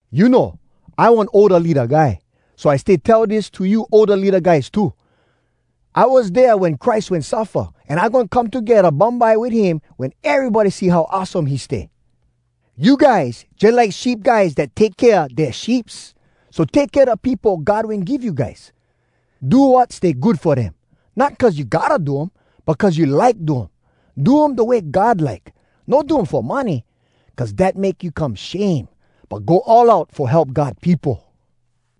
You know, I one older leada guy, so I stay tell dis to you older leada guys too: I was dea wen Christ wen suffa, an I goin come togedda bumbye wit him wen erybody see how awesome he stay. You guys jalike sheep guys dat take kea dea sheeps. So take kea da peopo God wen give you guys. Do wat stay good fo dem, not cuz you gotta do um, but cuz you like do um. Do um da way God like. No do um fo money, cuz dat make you come shame, but go all out fo help God peopo.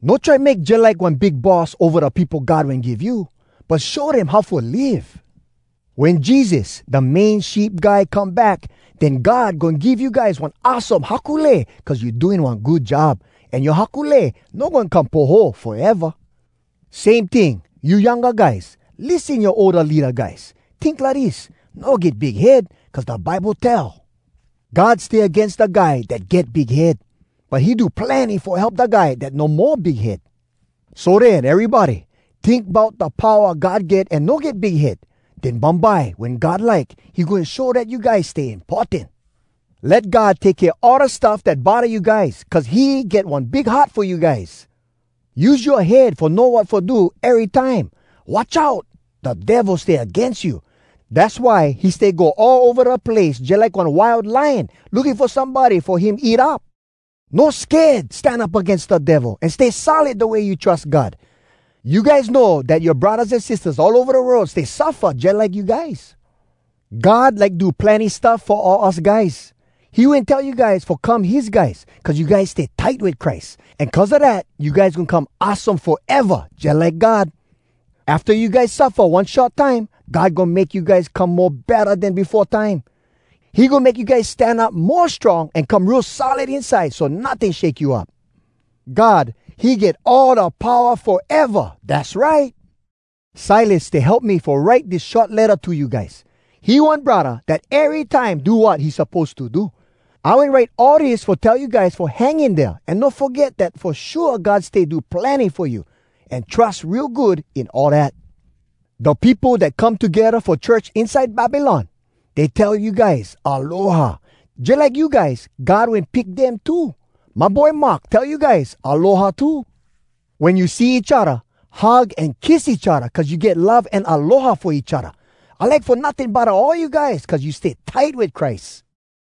No try make jalike one big boss ova da peopo God wen give you, but show dem how fo live. Wen Jesus, da Main Sheep Guy, come back, den God goin give you guys one awesome haku lei cuz you do one good job. An yoa haku lei no goin come poho, foeva. Same ting, you younga guys, lissen yoa older leada guys. Tink lidis: No get big head, cuz da Bible tell, “God stay agains da guy dat get big head, But he do plenny fo help da guy dat no mo big head.” So den erybody, tink bout da powa God get an no get big head. Den bumbye, wen God like, he goin show dat you guys stay importan. Let God take kea all da stuff dat bodda you guys cuz he get one big heart fo you guys. Use yoa head fo know wat fo do erytime! Watch out! Da Devil stay agains you. Dass why he stay go all ova da place jalike one wild lion, looking fo somebody fo him eat up. No sked stan up agains da Devil an stay solid da way you trus God. You guys know dat yoa braddahs an sistahs all ova da world stay suffa jalike you guys. God like do plenny stuff fo all us guys. He wen tell you guys fo come his guys, cuz you guys stay tight wit Christ. An cuz a dat you guys goin come awesome foeva jalike God. Afta you guys suffa one short time, God goin make you guys come mo betta den befo time. He goin make you guys stan up mo strong an come real solid inside so notting shake you up. God, he get all da powa foeva. Dass right! Silas stay help me fo write dis short letta to you guys. He one braddah dat erytime do wat he suppose to do. I wen write all dis fo tell you guys fo hang in dea an no foget dat fo shua God stay do plenny fo you. An trus real good in all dat! Da peopo dat come togedda fo church inside Babylon, dey tell you guys “Aloha.” Jalike you guys, God wen pick dem too. My boy Mark tell you guys “Aloha” too. Wen you see each odda, hug an kiss each odda cuz you get love an aloha fo each odda. I like fo notting bodda all you guys cuz you stay tight wit Christ.